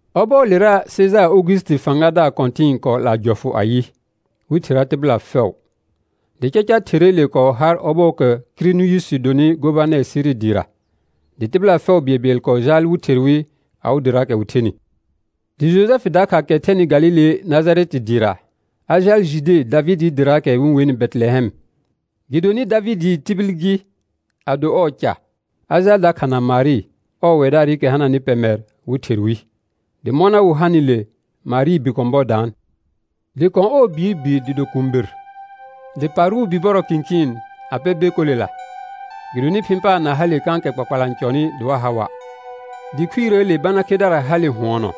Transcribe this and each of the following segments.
Ɔbɔɔlera, Sejaar Ogusiti fãgadaar kɔ̃tɩ̃ɩ kɔɔ 'laa jɔfʋ ayɩ, wɩ thera tɩbɩla fɛʋ. Dɩ caca therreele kɔɔ har ɔbɔɔkɛ Kiriniyusi donɩ gobanɛr Siri dɩɩra. Dɩ tɩbɩla fɛʋ bɩɛlbɩɛl kɔɔ jaal wɩ ther wɩ awɩ dɩraakɛ wɩ thenɩ. Dɩ Jojɛfɩ dakha kɛ thɛnɩ Galile Najarɛtɩ dɩɩra, a jaal Jude Davɩdɩɩ dɩraakɛ wɩ-n wenɩ Bɛtɩlɛhɛm, gɩdonɩ Davɩdɩɩ tibil gɩ a do ɔɔ ca. A jaal dakha na Marɩ, ɔɔ wɛdaarɩkɛ hananɩ pɛmɛr wɩ ther wɩ. Dɩ mɔna wɩ hanɩle, Marɩɩ bi kɔ̃ bɔ daan, dɩ kɔ̃ ɔɔ biir bi dɩ do kũubir, dɩ parʋʋ bibɔrɔ kɩ̃kɩɩn a pɛ bekolela, gɩdonɩ phɩ̃ paar na hale kãkɛ kpakpala n cɔnɩ dɩ wa ha wa'. Dɩ khuirəəle bana khedara hale hʋɔnɔ,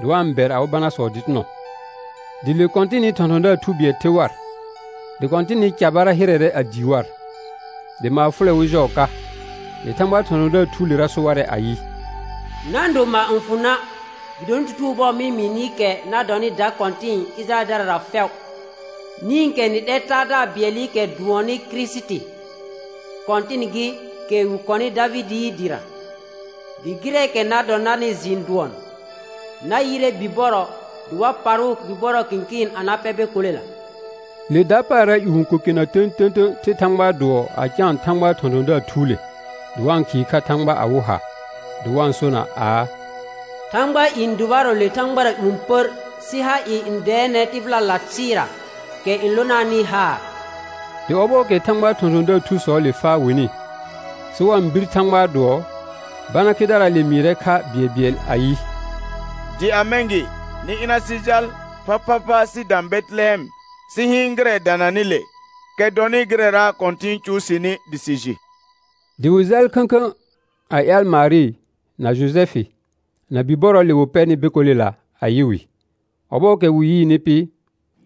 dɩ wa-n bɛr awɩ banasɔ dɩtɩnɔ. Dɩ le Kɔ̃tɩnɩ thɔ̃thɔ̃daar thu bɩɛl the war, dɩ Kɔ̃tɩnɩ carbara hɩrɛrɛ a dii war. Dɩ maar fʋlɛ wɩ jɔɔ ka. Dɩ Thãgbaa thɔ̃thɔ̃daar thuulera so warɛ ayɩ: Na-n do maar n fʋ na', gɩdonɩ tutugo bʋɔ mɩ-n mɩɩ nɩ kɛ na dɔnɩ da kɔ̃tɩ̃ɩ Ɩjɩrayɛldarara fɛʋ. Nĩkɛ nɩ 'lɛr Taadaar bɩɛlɩkɛ dʋɔnnɩ Kirisiti, Kɔ̃tɩn gɩ, kɛ wɩ kɔnɩ Davɩdɩɩ dɩra. Dɩ gɩrɛɛkɛ na dɔ narnɩ jɩɩn dʋɔn: Na yɩrɛ bibɔrɔ, dɩ wa parʋʋ bibɔrɔ kɩ̃kɩɩn na pɛ bekolela. Le dapaara ƴũ ko kena tə̃tə̃tə̃ the Thãgbaa dʋɔ a caan Thãgbaa thɔ̃thɔ̃daar thuule, dɩ wa-n khɩɩ kha Thãgba awɩ ha, dɩ wa-n sona aa: Thãgbaa i n dʋbarɔ le thãgbara ƴũ pər, sɩ ha ɩɩ n dɛɛnɛ tɩbɩlala thɩɩra, kɛ n lonaanɩ haar. Dɩ ɔbɔɔkɛ Thãgbaa thɔ̃thɔ̃daar thusɔɔle faa wɩnɩ, sɩ wa-n bir Thãgbaa dʋɔ, bana khedaraale mɩɩrɛ kha bɩɛlbɩɛl ayɩ: Dɩ a mɛ̃ gɩ, nɩ ɩna sɩ jal phaphapha sɩ dã Bɛtɩlɛhɛm sɩ hɩɩn gɩrɛ dananɩ le, kɛ dɔnɩ gɩrɛra Kɔ̃tɩn cʋʋ sɩnɩ dɩ sɩ jɩ. Dɩ wɩ jaal khə̃khə̃ a ƴaal Marɩ, na Jojɛfɩ, na bibɔrɔɔle wɩ pɛnɩ bekolela a yɩ wɩ. Ɔbɔɔkɛ wɩ yɩɩnɩ pɩ,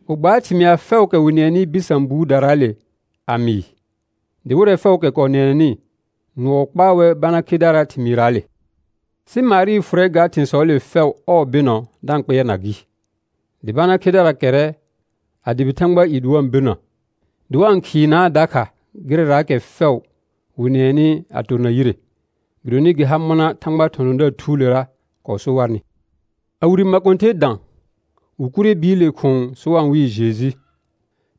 wɩ gbaar thɩmɩa fɛʋʋkɛ wɩ nɩɛnɩ bɩsã buudaraale a mɩɩ. Dɩ wɩrɛ fɛʋʋkɛ kɔɔ nɩɛnɛnɩ, nʋɔ kpaa wɛr bana khedaraa thɩmɩɩraale. Sɩ Marɩ fʋrɛ ga thɩ̃sɔɔle fɛʋ ɔɔ bɩnɔ da-n kpɩɛrna gɩ. Dɩ bana khedara kɛrrɛ a dʋbɩ Thãgbaa i dɩ wa-n birnə, dɩ wa-n khɩɩnaa dakha gɩrɛraakɛ fɛʋ wɩ nɩɛnɩ a torna yire, gɩdonɩ gɩ har mɔna Thãgbaa thɔ̃thɔ̃daar thuulera kɔɔ so warnɩ. A wire makõther dã, wɩ kurre biile khʋ̃ʋ sɩ wa-n wɩɩ Jeju,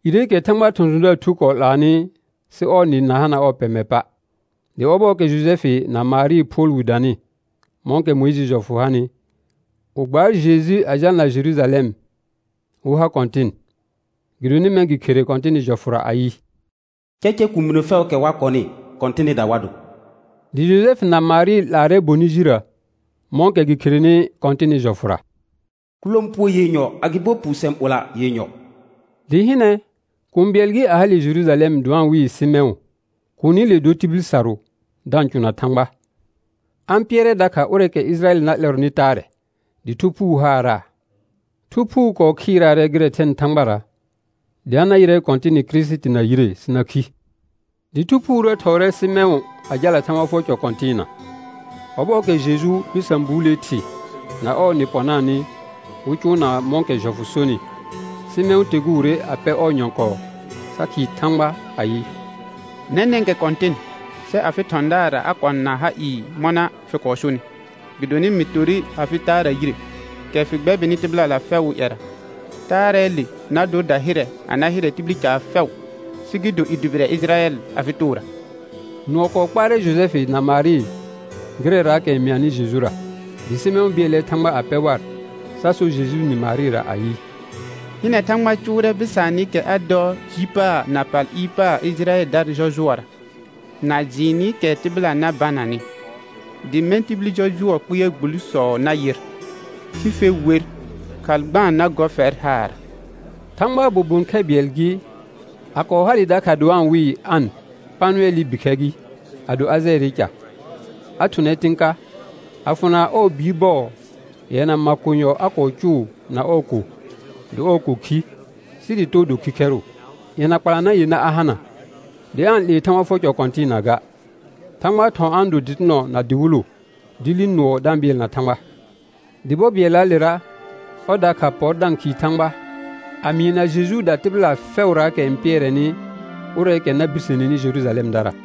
ireekɛ Thãgbaa thɔ̃thɔ̃daar thu kɔɔ 'laanɩ sɩ ɔɔ nɩ na hana ɔɔ pɛmɛ pa'. Dɩ ɔbɔɔkɛ Jojɛfɩ na Marɩɩ phʋɔl wi danɩ, mɔ̃kɛ Mʋɩjɩɩ jɔfʋ hanɩ, wɩ gbaar Jeju a jalna Jerujalɛm wɩ ha Kɔ̃tɩn. Gɩdonɩ mɛ̃ gɩ khere Kɔ̃tɩnɩ jɔfʋra ayɩ: «Caca kuuminə fɛʋʋkɛ wa kɔnɩ, Kɔ̃tɩnɩda wa do.» Dɩ Jojɛfɩ na Marɩ 'laarɛ bonɩ jirrə, mɔ̃kɛ gɩ kherenɩ Kɔ̃tɩnɩ jɔfʋra, «kʋlãpuo yenyɔ agɩbo puusɛ̃ ɓɔla yenyɔ.» Dɩ hɩnɛ, kũu bɩɛl gɩ, a hale Jerujalɛm dɩ wa-n wɩɩ Sɩmɛ̃ʋ. Kuunile dor tibil sarʋ, da-n cʋna Thãgba. A-n pɩɛrɛ dakha ʋrɛɛkɛ Ɩjɩrayɛl na 'lɛrɔnɩ taarɛ, dɩ Thu Phuu haaraa. Thu Phuu kɔɔ khɩɩraarɛ gɩrɛ thɛnɩ Thãgbara, dɩ a na yɩrɛ Kɔ̃tɩnɩ Kirisiti na yire sɩ na khi. Dɩ Thu Phuurə thɔɔrɛ Sɩmɛ̃ʋ a jalna Thãgba fʋɔr cɔ kɔ̃tɩɩna. Ɔbɔɔkɛ Jeju bɩsã buulee thɩ na ɔɔ nɩ pɔnaanɩ, wɩ cʋʋnaa mɔ̃kɛ jɔfʋ sonɩ, Sɩmɛ̃ʋ teguure a pɛ ɔɔ nyɔ̃kɔɔ sa khɩɩ Thãgba ayɩ: Nɛnɛ̃kɛ Kɔ̃tɩn, sɛ afɩ thɔ̃daarra a kɔ̃ na ha ɩɩ mɔna fɩ kɔɔ sonɩ; gɩdonɩ mɩ torre afɩ taara yire, kɛ fɩ gbɛbɩnɩ tɩbɩla fɛʋʋ ƴɛra. Taarɛɛle na dor dahɩrɛ a na hɩrɛ tibil caar fɛʋ, sɩ gɩ do i dʋbɩrɛ Ɩjɩrayɛl afɩ toora. Nʋɔ kɔɔ kpaarɛ Jojɛfɩ na Marɩ gɩrɛraakɛ n mɩanɩ Jejura. Dɩ Sɩmɛ̃ʋ bɩɛlɛ Thãgba a pɛ war, sa so Jejuu nɩ Marɩra ayɩ: Hɩnɛ, Thãgba cʋʋrɛ bɩsaanɩkɛ a dɔ ji paar na pal ɩɩr paar Ɩjɩrayɛldara jɔjʋɔra, na jɩɩnɩkɛ tɩbɩla na bananɩ; dɩ mɛ̃ tibil jɔjʋɔɔ kpɩɛr gbulsɔ na yɩr, sɩ fe wer, khalghãa na gɔ fɛr haarra. Thãgbaa bobon khɛ bɩɛl gɩ, a kɔɔ hale dakha dɩ wa-n wɩɩ An Panʋɛlɩ bikhɛr gɩ, a do Ajɛɛrɩ ca. A thʋnɛ tɩ̃ ka. A fʋna ɔɔ biir bɔɔ yɛna makonyɔ a kɔɔ cʋʋ na ɔɔ ko, dɩ ɔɔ ko khi, sɩ dɩ too do khikhɛrʋ. Yɛna kpalanã yenã a hana, dɩ aa-n 'lee Thãgba fʋɔr cɔ kɔ̃tɩɩna ga; Thãgbaa thɔ̃ a-n do dɩtɩnɔ na dɩwɩlʋ, dɩ li nʋɔ da-n bɩɛlna Thãgba. Dɩ bɔ bɩɛllaalera, ɔr dakha pɔr da-n khɩɩ Thãgba a mɩɩna Jejuuda tɩbɩla fɛʋraakɛ n pɩɛrɛnɩ ʋrɛɛkɛ na birseneni Jerujalɛmdara.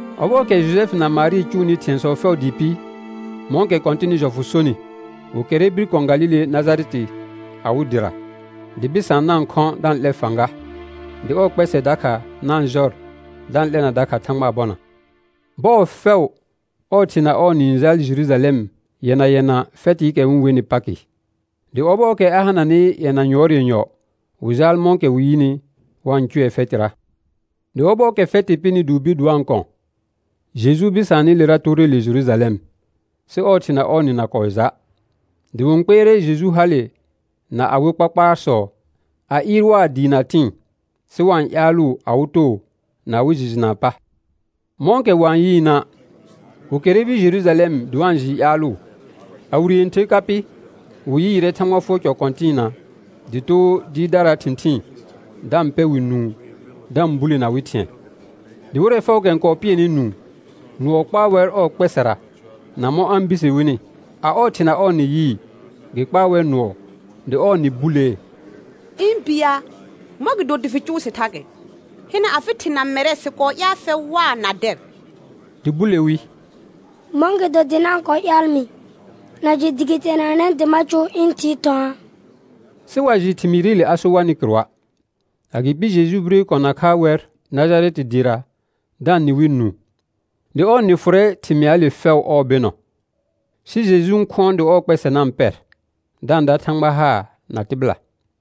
Ɔbɔɔkɛ Jojɛfɩ na Marɩ cʋʋnɩ thɩ̃ɛsɔ fɛʋ dɩɩ pɩ, mɔ̃kɛ Kɔ̃tɩnɩ jɔfʋ sonɩ, wɩ kɛrrɛ bir kɔ̃ Galile Najarɛtɩ awɩ dɩra. Dɩ bɩsaan na-n khɔ̃ da-n 'lɛ fãga, dɩ ɔɔ kpɛsɛ dakha na-n jɔr da-n 'lɛna dakha Thãgbaa bɔna. Bɔɔ fɛʋ ɔɔ thɩ na ɔɔ nɩ n jaal Jerujalɛm yɛna yɛna fɛtɩɩkɛ wɩ-n wenɩ Pakɩ. Dɩ ɔbɔɔkɛ a hananɩ yɛna yʋɔr yenyɔ, wɩ jaal mɔ̃kɛ wɩ yɩnɩ wa-n cʋɛ fɛtɩra. Dɩ ɔbɔɔkɛ fɛtɩ pɩnɩ dɩ wɩ bir dɩ wa-n kɔ̃, Jeju bɩsaanɩlera toore le Jerujalɛm, sɩ ɔɔ thɩ na ɔɔ nɩ na kɔɔ ja'. Dɩ wɩ-n kpɩɛrɛ Jeju hale na awɩ kpakpaarsɔ, a ɩɩr waa dɩɩ na tɩ̃ɩ, sɩ wa-n ƴaalʋʋ awɩ too na awɩ jɩ jɩnaa pa. Mɔ̃kɛ wa-n yɩɩna', wɩ kɛrrɛ bir Jerujalɛm dɩ wa-n jɩɩ ƴaalʋʋ. A wire yẽther ka pɩ, wɩ yɩɩrɛ Thãgba fʋɔr cɔ kɔ̃tɩɩna dɩ too dɩɩrdaraa thɩ̃thɩɩn, da-n pɛ wɩ nũu da-n bulena wɩ thɩ̃ɛ. Dɩ wɩrɛ fɛʋʋkɛ n kɔɔ pɩɛnɩ nũu, nʋɔ kpaa wɛr ɔɔ kpɛsɛra na mɔ̃ a-n birse wini. A ɔɔ thɩ na ɔɔ nɩ yɩɩ, gɩ kpaa wɛr nʋɔ, dɩ ɔɔ nɩ bulee: Ɩ̃ bi ya, mɔ̃gɩdo dɩ fɩ cʋʋ sɩ thakɛ? Hɩnɛ, afɩ thɩ na mɛrɛ, sɩ kɔɔ ƴaal fɛr waa na dɛr. Dɩ bule wi: Mɔ̃gɩdo dɩ na-n kɔɔ ƴaal mɩ? Na jɩ dɩ gɩ teenanɛ dɩ ma cʋʋ ɩ̃ Thɩɩ thɔ̃aa? Sɩ wa jɩ thɩmɩɩrɩle a so warnɩ kɩrʋa'. Agɩpɩ Jeju bire kɔ̃ nakha wɛr Najarɛtɩ dɩɩra da-n nɩ wɩ nũu. Dɩ ɔɔ nɩ fʋrɛ thɩmɩaale fɛʋ ɔɔ bɩnɔ. Sɩ Jeju n khʋɔn dɩ ɔɔ kpɛsɛ na-n pɛr, da-n da Thãgba haar na tɩbɩla.